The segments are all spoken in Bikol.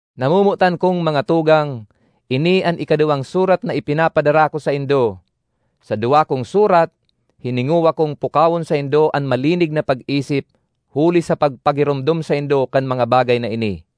Namomotan kong mga tugang, ini an ikaduwang surat na ipinapadara ko saindo. Sa duwa kong surat, hiningowa kong pukawon saindo an malinig na pag-isip huli sa pagpagiromdom saindo kan mga bagay na ini.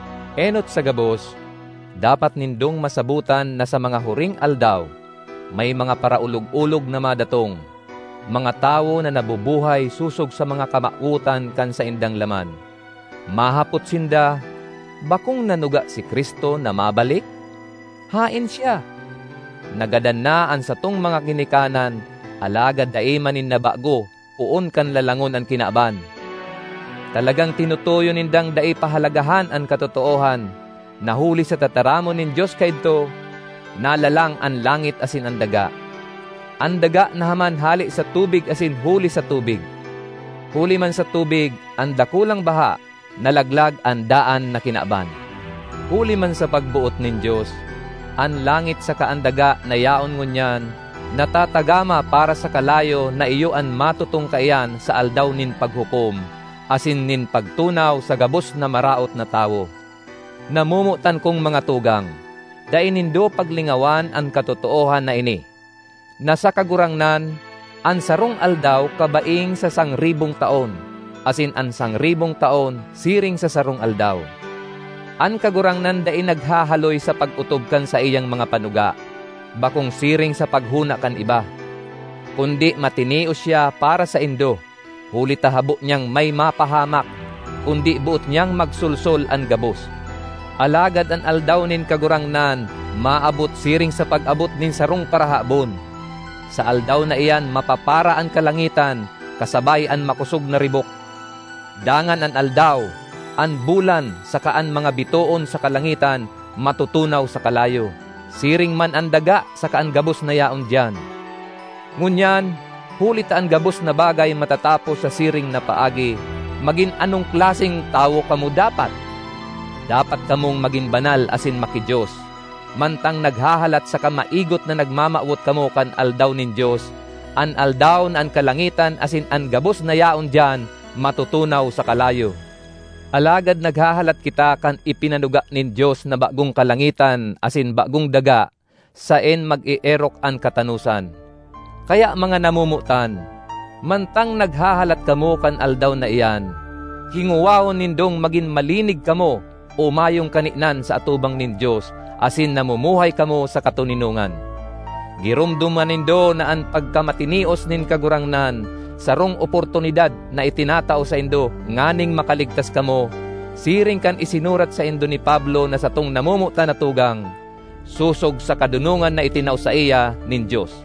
Enot sa gabos, dapat nindong masabotan na sa mga huring aldaw, may mga paraolog-olog na madatong, mga tawo na nabubuhay sosog sa mga kamawotan kan saindang laman. Mahapot sinda, “Bakong nanuga si Cristo na mabalik? Haen siya? Nagadan na an satong mga ginikanan, alagad dai man nin nabago poon kan lalangon an kinaban!” Talagang tinutuyo nindang dai pahalagahan an katotoohan, na huli sa tataramon nin Dios kaidto, nalalang an langit asin an daga. An daga nahaman hale sa tubig asin huli sa tubig. Huli man sa tubig—an dakulang baha—nalaglag an daan na kinaban. Huli man sa pagboot nin Dios, an langit saka an daga na yaon ngunyan, natatagama para sa kalayo na iyo an matutong kaiyan sa Aldaw nin Paghukom asin nin pagtunaw sa gabos na maraot na tawo. Namomotan kong mga tugang, dai nindo paglingawan an katotoohan na ini: na sa Kagurangnan, an sarong aldaw kabaing sa sangribong taon; asin an sangribong taon siring sa sarong aldaw. An Kagurangnan dai naghahaloy sa pag-otob kan saiyang mga panuga, bakong siring sa paghona kan iba. Kundi matinios siya para saindo, huli ta habo niyang may mapahamak, kundi boot niyang magsolsol an gabos. Alagad an Aldaw nin Kagurangnan maabot siring sa pag-abot nin sarong parahabon. Sa Aldaw na iyan mapapara an kalangitan kasabay an makosog na ribok. Dangan an aldaw, an bulan saka an mga bitoon sa kalangitan matutunaw sa kalayo, siring man an daga saka an gabos na yaon diyan. Ngunyan, huli ta an gabos na bagay matatapos sa siring na paagi, magin anong klaseng tawo kamo dapat? Dapat kamong magin banal asin maki-Dios, mantang naghahalat saka maigot na nagmamawot kamo kan Aldaw nin Dios, an aldaw na an kalangitan asin an gabos na yaon diyan matutunaw sa kalayo. Alagad naghahalat kita kan ipinanuga nin Dios na bagong kalangitan asin bagong daga saen mag-eerok an katanosan. Kaya mga namomotan, mantang naghahalat kamo kan Aldaw na iyan, hingowahon nindong magin malinig kamo o mayong kaninan sa atubang nin Dios asin namumuhay kamo sa katoninongan. Giromdoma nindo na an pagkamatinios nin Kagurangnan sarong oportunidad na itinatao saindo nganing makaligtas kamo, siring kan isinurat saindo ni Pablo na satong namomotan na tugang, sosog sa kadonongan na itinao saiya nin Dios.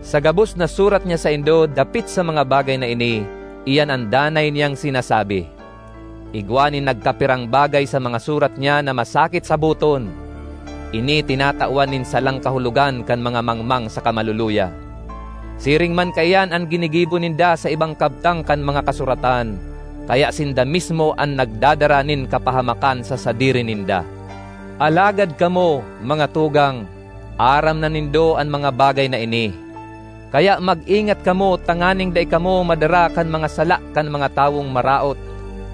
Sa gabos na surat niya saindo dapit sa mga bagay na ini, iyan an danay niyang sinasabi. Igwa nin nagkapirang bagay sa mga surat niya na masakit saboton; ini tinatawan nin salang kahulogan kan mga mangmang saka maluluya. Siring man kaiyan an ginigibo ninda sa ibang kabtang kan mga Kasuratan, kaya sinda mismo an nagdadara nin kapahamakan sa sadiri ninda. Alagad kamo, mga tugang, aram na nindo an mga bagay na ini, kaya mag-ingat kamo tanganing dai kamo madara kan mga sala kan mga tawong maraot,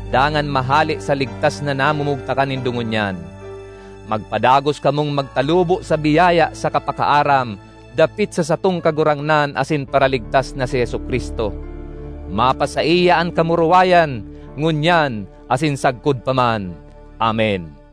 dangan mahale sa ligtas na namumugtakan nindo ngunyan. Magpadagos kamong magtalubo sa biyaya saka pakaaram dapit sa satong Kagurangnan asin Paraligtas na si Jesu-Cristo. Mapasaiya an kamurawayan ngunyan asin sagkod pa man! Amen.